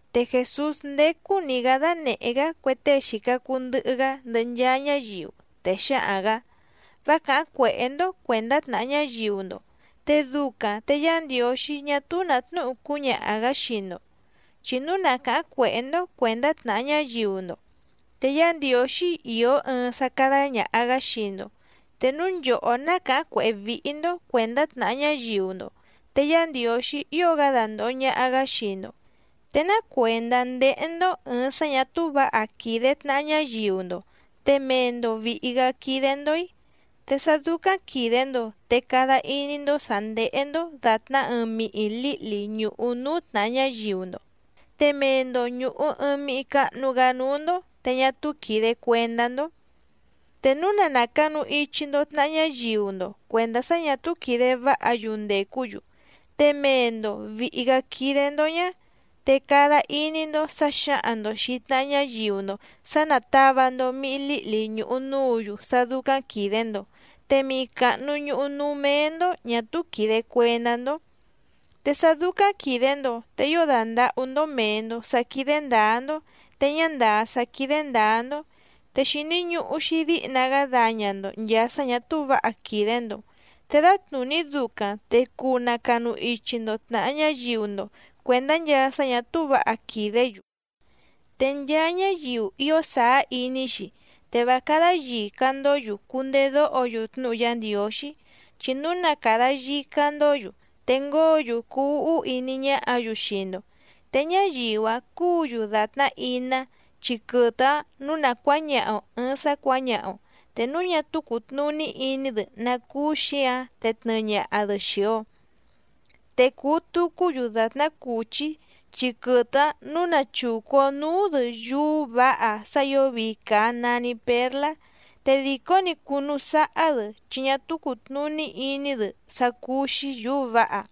Te Jèsús nděcuu‑ni‑gá dánèhé‑gá cue tée xìca cuu ndɨhɨ‑gá ndɨhɨ nchaa ñáyiu, te xǎhaⁿ‑gǎ: —Vá càháⁿ cuèhé‑ndó cuèndá tnàha ñáyiu‑ndo, te ducaⁿ te Yá Ndiǒxí ñá túú nǎ tnúhu cúñaha‑gǎ xii‑ndo. Chi núu na càháⁿ cuèhé‑ndó cuèndá tnàha ñáyiu‑ndo, te Yá Ndiǒxí ìó ɨɨⁿ sá cádá ñàha‑gá xii‑ndo. Te núu nchòhó ná càháⁿ cuèhé víhí‑ndó cuèndá tnàha ñáyiu‑ndo te Yá Ndiǒxí ío‑gá dandòho ñaha‑gá xii‑ndo. ¿Te ná cuèndá ndéhé‑ndó ɨ̀ɨⁿ sá ñà túú vǎha quìde tnaha ñáyiu‑ndo te mee‑ndo vìhi‑gá quídé‑ndó‑í? Te sá dúcáⁿ quìde‑ndo te cada iní‑ndó sǎ ndéhé‑ndó dàtná ɨɨⁿ mihi lǐhli ñùhu núú tnàha ñáyiu‑ndo te mee‑ndo ñùhu ɨɨⁿ mihi cahnu‑gá núú‑ndó te ñá túú quìde cuendá‑ndó. Te núu na nàcanu ichi‑ndo tnaha ñáyiu‑ndo cuèndá sá ñà túú quìde váha‑yu ndècú‑yu, te mee‑ndo vìhi‑gá quídé‑ndó ñá, te cada iní‑ndó sǎ xǎhaⁿ‑ndo xìi tnaha ñáyiu‑ndo sǎ nátàva‑ndo mihi líhli ñùhu núǔ‑yu sá dúcáⁿ quìde‑ndo, te mihi càhnu ñuhu núú méé‑ndó ñà túú quìde cuendá‑ndó. Te sá dúcáⁿ quìde‑ndo te ío dàndahú‑ndó mèe‑ndo sá quídé ndǎá‑ndó te ñá ndàá sá quídé ndǎá‑ndó, te xìni ñuhu‑xi díhna‑gá daña‑ndo nchàa sá ñà túú vǎha quìde‑ndo, te dǎtnùní ducaⁿ te cuu nacanu ichi‑ndo tnàha ñáyiu‑ndo cuèndá nchaa sá ñà túú vǎha quìdé‑yu. ’Te nchaa ñáyiu ío sàá iní‑xi, te vá cádá yìca‑ndó‑yu cundedóho‑yu tnúhu Yá Ndiǒxí, chi núu na càda yica‑ndó‑yu te ngóo‑yu cuu úhú iní ñáhǎ‑yu xii‑ndo. Te ñáyiu‑áⁿ cúǔ‑yu dàtná iná chi quɨtɨ‑áⁿ nǔu na cuǎñaha‑o ɨ̀ɨⁿ sá cuǎñaha‑o, te núu ñá túú cùtnuní iní‑dɨ ná cúú xǐǎⁿ te tnɨɨ ñaha‑dɨ xìi‑o. Te cùu tucú‑yu dàtná cùchí chi quɨtɨ‑áⁿ nǔu na chùcu‑o núú‑dɨ yúú vǎha sá ǐo vii càa nani pérlá, te dìcó‑ni cùnu sáhá‑dɨ chi ñá túú cùtnuní iní‑dɨ sá cúú‑xí yǔú vǎha.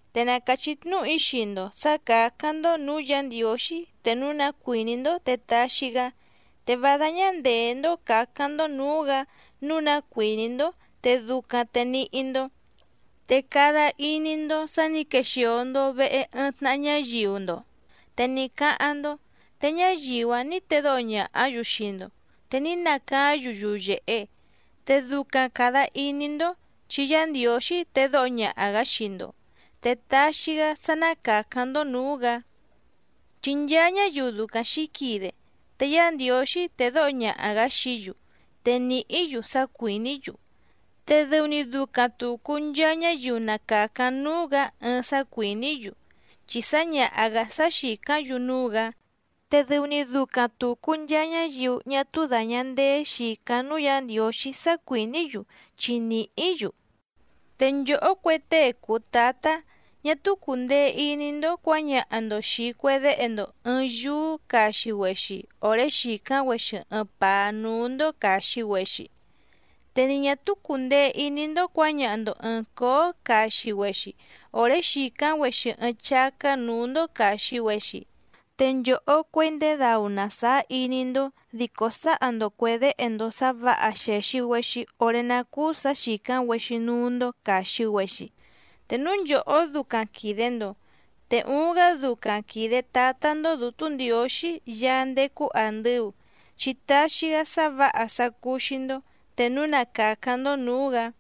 ’Te na càchí tnúhu‑í xii‑ndo sǎ cǎcáⁿ‑ndó nǔú Yǎ Ndiǒxí te núu ná cuìní‑ndó te taxi‑gá, te vá dáñá ndèé‑ndó cǎcáⁿ‑ndó nǔú‑gǎ nǔu ná cuìní‑ndó te ducaⁿ te níhí‑ndó. Te cada iní‑ndó sǎ nǐ quexìo‑ndo vehe ɨɨⁿ tnaha ñáyiu‑ndo te ní cáháⁿ‑ndó, te ñáyiu‑áⁿ nǐ tedóho ñàhá‑yu xii‑ndo te ní nacaáⁿ‑yu yuyèhe. Te ducaⁿ càda iní‑ndó chi Yá Ndiǒxí tedóho ñaha‑gǎ xii‑ndo, te taxi‑gá sá ná càcáⁿ‑ndó nǔú‑gǎ. Chi nchaa ñáyiu ducaⁿ xǐquide, te Yá Ndiǒxí tédǒho ñaha‑gǎ xií‑yu te nìhí‑yu sá cuìní‑yu. Te dɨu‑ni ducaⁿ tùcu nchaa ñáyiu na càcáⁿ núú‑gǎ ɨɨⁿ sá cuìní‑yu, chi sǎñaha‑gǎ sá xìcáⁿ‑yu núú‑gǎ. Te dɨu‑ni ducaⁿ tùcu nchaa ñáyiu ñá túú dàña ndeé xìcáⁿ núú Yǎ Ndiǒxí sá cuìní‑yu chi nìhí‑yu. ’Te nchòhó cue tée cùu tátá, ñá túú cùndee iní‑ndó cuǎñaha‑ndo xìi cue déhe‑ndo ɨ̀ɨⁿ yúú caxi‑güexi òré xìcáⁿ‑güexi ɨɨⁿ pàá núú‑ndó càxi‑güexi. Te ni ñà túú cùndee iní‑ndó cuǎñaha‑ndo ɨ̀ɨⁿ cóó caxi‑güexi òré xìcáⁿ‑güexi ɨɨⁿ chácá nǔú‑ndó càxi‑güexi. Te nchòhó cuěi ndèé dau‑na sàá iní‑ndó dico sǎha‑ndo cuè déhe‑ndo sǎ vǎha xèxi‑güexi oré ná cúú sǎ xìcáⁿ‑güexi núú‑ndó càxi‑güexi. Te núu nchòhó ducaⁿ quìde‑ndo, ¡te uuⁿ‑gá ducaⁿ quìde Tátá‑ndó Dǔtú Ndiǒxí Yaá ndécú àndɨu, chi taxi‑gá sá vǎha sá cúú‑xí‑ndó te núu na càcáⁿ‑ndó nǔú‑gǎ!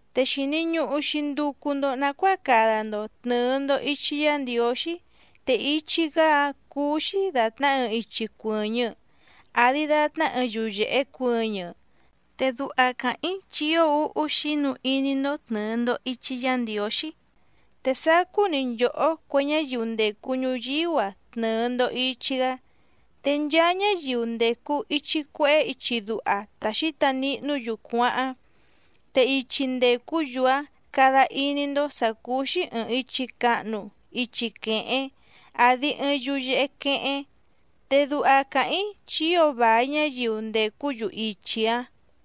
’Te xìni ñuhu‑xi nducu‑ndo nacuáa cada‑ndo tnɨ̀ɨ‑ndo ichi Yá Ndiǒxí. Te ichi‑gá‑áⁿ cúú‑xí dàtná ɨɨⁿ ichi cuɨ̀ñɨ, àdi datná ɨɨⁿ yuyèhe cuɨñɨ. Te duha càháⁿ‑í chi ío úhú xínu iní‑ndó tnɨ̀ɨ‑ndo ichi Yá Ndiǒxí, te sacú‑ni nchòhó cue ñáyiu ndècu ñuyíú‑a tnɨɨ‑ndo ìchi‑gá. Te nchaa ñáyiu ndècu ichi cuehé ichi duha ta xǐta nihnú‑yu cuáháⁿ. Te ichi ndècú‑yu‑áⁿ cada iní‑ndó sǎ cúú‑xí ɨ̀ɨⁿ ichi cahnu ichi quehéⁿ, àdi ɨɨⁿ yuyehe quehéⁿ. Te duha càháⁿ‑í chi ío vài ñáyiu ndècú‑yu ichi‑áⁿ.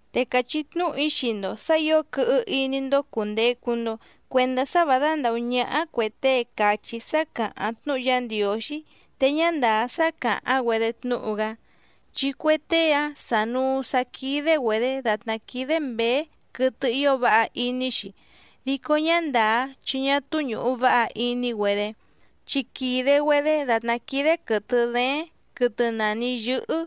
’Te càchí tnúhu‑í xii‑ndo sǎ ǐo quɨhɨ iní‑ndó cùndecu‑ndo cuendá sá vǎ dándàhú ñáhá cuè tée càchí sá càháⁿ tnúhu Yá Ndiǒxí te ñá ndàá sá càháⁿ‑güedé tnúhu‑gá. Chi cue tée‑áⁿ sànuu sá quídé‑güedě dàtná quídé mběé quɨtɨ ío váha iní‑xi, dico ñá ndàá chi ñá túú ñùhu váha iní‑güedé, chi quìde‑güedé dàtná quídé quɨ̀tɨ dééⁿ quɨtɨ nàni yɨ́hɨ́.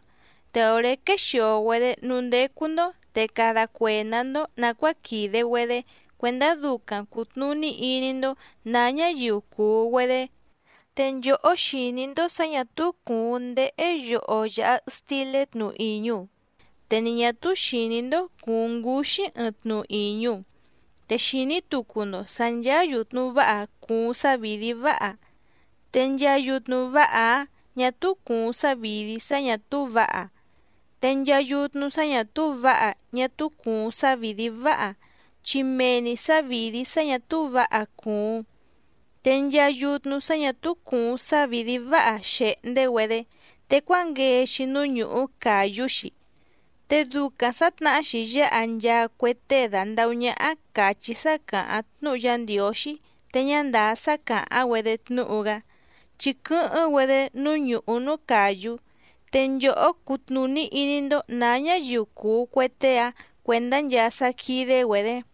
Te òré quexìo‑güedé núú ndécú‑ndó te cada cuèndá‑ndó nàcuáa quìde‑güedé cuèndá ducaⁿ cùtnuní iní‑ndó nǎ ñáyiu cùu‑güedé. Te nchòhó xìní‑ndó sǎ ñà túú cùuⁿ ndéhé yoho yàha stilé tnu ìñu, te ni ñà túú xìní‑ndó cùuⁿ ngúxí ɨɨⁿ tnu ìñu. Te xìní tucu‑ndo sǎ ncháá yùtnu váha cùuⁿ sávìdí váha, te nchaa yutnu váha‑áⁿ ñà túú cùuⁿ sávìdí sá ñà túú vǎha. Te nchaa yutnu sá ñà túú vǎha ñá túú cùuⁿ sávìdí váha, chi mee‑ni sǎvìdí sá ñà túú vǎha cùuⁿ. Te nchaa yutnu sá ñà túú cùuⁿ sávìdí váha xèhndé‑güedé, te cuánguee‑xi núú ñùhú càyú‑xi. Te ducaⁿ sǎtnahá‑xi yáha nchaa cue tée dàndahú ñáhá càchí sá càháⁿ tnúhu Yá Ndiǒxí te ñá ndàá sá càháⁿ‑güedé tnúhu‑gá, chi quɨ́hɨ́ⁿ‑güedé núú ñùhú núú càyú. Te nchòhó cutnùní iní‑ndó nǎ ñáyiu cùu cue tée‑áⁿ cuèndá nchaa sá quídé‑güedě.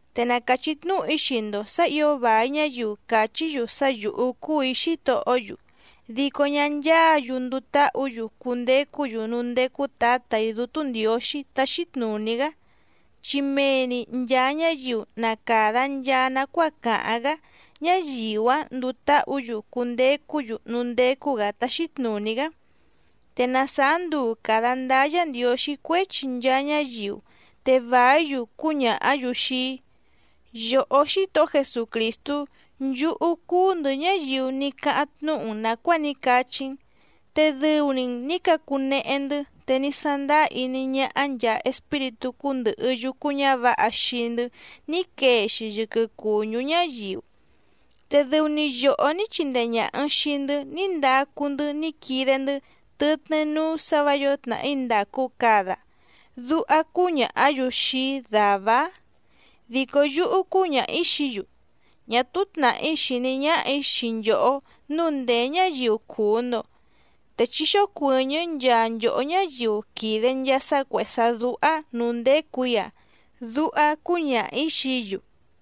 ’Te na càchí tnúhu‑í xii‑ndo sǎ ǐo vài ñáyiu cachí‑yu sá yǔhú cúù‑í Xítohó‑yu, dico ñá ncháǎ‑yu nduu táhǔ‑yu cundecú‑yu núú ndécú Tǎtà‑í Dútú Ndiǒxí táxí tnùní‑gá, chi mee‑ni nchàa ñáyiu na càda nchaa nacuáa càháⁿ‑gá ñáyiu‑áⁿ nduu táhǔ‑yu cundecú‑yu núú ndécú‑gǎ táxí tnùní‑gá. Te na sàá nduu càda ndáá Yǎ Ndiǒxí cuéchi nchaa ñáyiu, te vàí‑yu cúñàhá‑yu xii‑í: “Yòhó Xítohó Jesucrìstú nchúhú cúú‑ndɨ̌ ñáyiu ní cáháⁿ tnúhu‑n nàcuáa ní cachí‑n, te dɨu‑ni‑n nǐ cacunehe‑ndɨ́ te ní sándáá iní ñáhá nchàa espíritú cúndɨ̀hɨ yucu ñávǎha xii‑ndɨ́ ní quee‑xi yɨquɨ cùñú ñáyiu, te dɨu‑ni yòhó ní chindee ñàha‑n xii‑ndɨ́ ní ndacu‑ndɨ́ ní quide‑ndɨ́ tɨtnɨ́ núú sǎ vǎ yǒo tnàhí ndàcu cada”, duha cúñàhá‑yu xii‑í dàvá‑áⁿ. Dico yúhú cúñaha‑ǐ xií‑yu: “Ñá túú tnàhí xìní ñáhà‑í xii nchòhó nǔu ndèé ñáyiu cùu‑ndo, te chí xócuɨ̀ñɨ́ nchaa nchòhó ñáyiu quìde nchaa sá cuèhé sá dúhá nǔú ndécù‑í‑a”, duha cúñaha‑ǐ xií‑yu.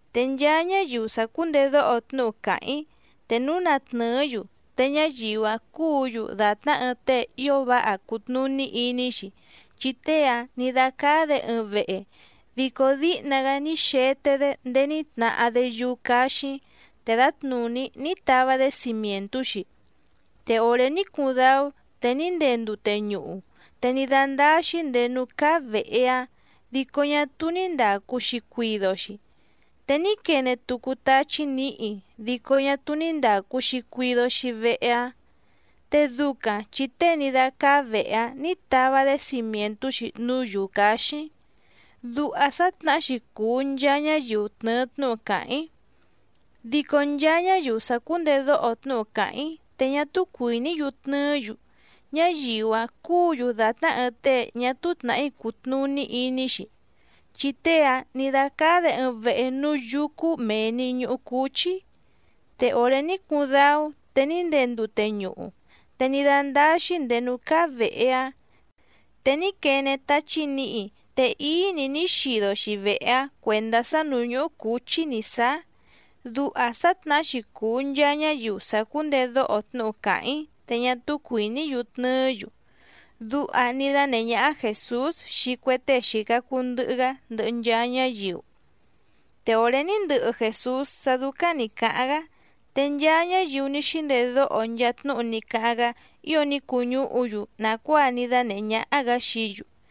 ’Te nchaa ñáyiu sàcúndedóho tnúhu càháⁿ‑í te núu na tnɨ̀ɨ́‑yu, te ñáyiu‑áⁿ cúǔ‑yu dàtná ɨɨⁿ tée ío váha cùtnuní iní‑xi. Chi tée‑áⁿ nǐ dácáá‑dě ɨɨⁿ vehe, dico díhna‑gá ní xete‑dé ndéé ní tnahá‑dé yúú cáxíⁿ te dǎtnùní ní tava‑dé cimièntú‑xi. Te òré ní cuuⁿ dáú te ní ndee ndute ñuhu, te ní dándáá‑xí nděé núú cáá vèhe‑áⁿ, dico ñá túú ní ndàcu‑xi cuido‑xi. Te ní quene tucu táchí nǐhi dico ñá túú ní ndàcu‑xi cuido‑xi vehe‑áⁿ, te ducaⁿ chi tée ní dácáá vèhe‑áⁿ nǐ tava‑dé cimièntú‑xi núú yǔú cáxíⁿ. Duha sǎtnahá‑xi cùu nchaa ñáyiu tnɨ̀ɨ tnúhu càháⁿ‑í. Dico nchaa ñáyiu sàcúndedóho tnúhu càháⁿ‑í te ñá túú cuìní‑yu tnɨɨ́‑yu, ñáyiu‑áⁿ cúǔ‑yu dàtná ɨɨⁿ tée ñá túú tnàhí cùtnuní iní‑xi. Chi tée‑áⁿ nǐ dácáá‑dě ɨɨⁿ vehe núú yúcú mèe‑ni ñuhu cúchí. Te òré ní cuuⁿ dáú te ní ndee ndute ñuhu, te ní dándáá‑xí nděé núú cáá vèhe‑áⁿ, te ní quene táchí nǐhi te íí‑ni ní xido‑xi vehe‑áⁿ cuèndá sá nǔú ñuhu cúchí nǐ sáá. Duha sǎtnahá‑xi cùu nchaa ñáyiu sàcúndedóho tnúhu càháⁿ‑í te ñá túú cuìní‑yu tnɨɨ́‑yu —duha ní dánèhé ñáhá Jèsús xii cue tée xìca cuu ndɨhɨ‑gá ndɨhɨ nchaa ñáyiu. Te òré ní ndɨhɨ Jèsús sá dúcáⁿ nǐ cáháⁿ‑gá, te nchaa ñáyiu ní xíndedóho nchaa tnúhu ní cáháⁿ‑gá ío ní cuñúhu‑yu nàcuáa ní dánèhé ñáhá‑gǎ xií‑yu.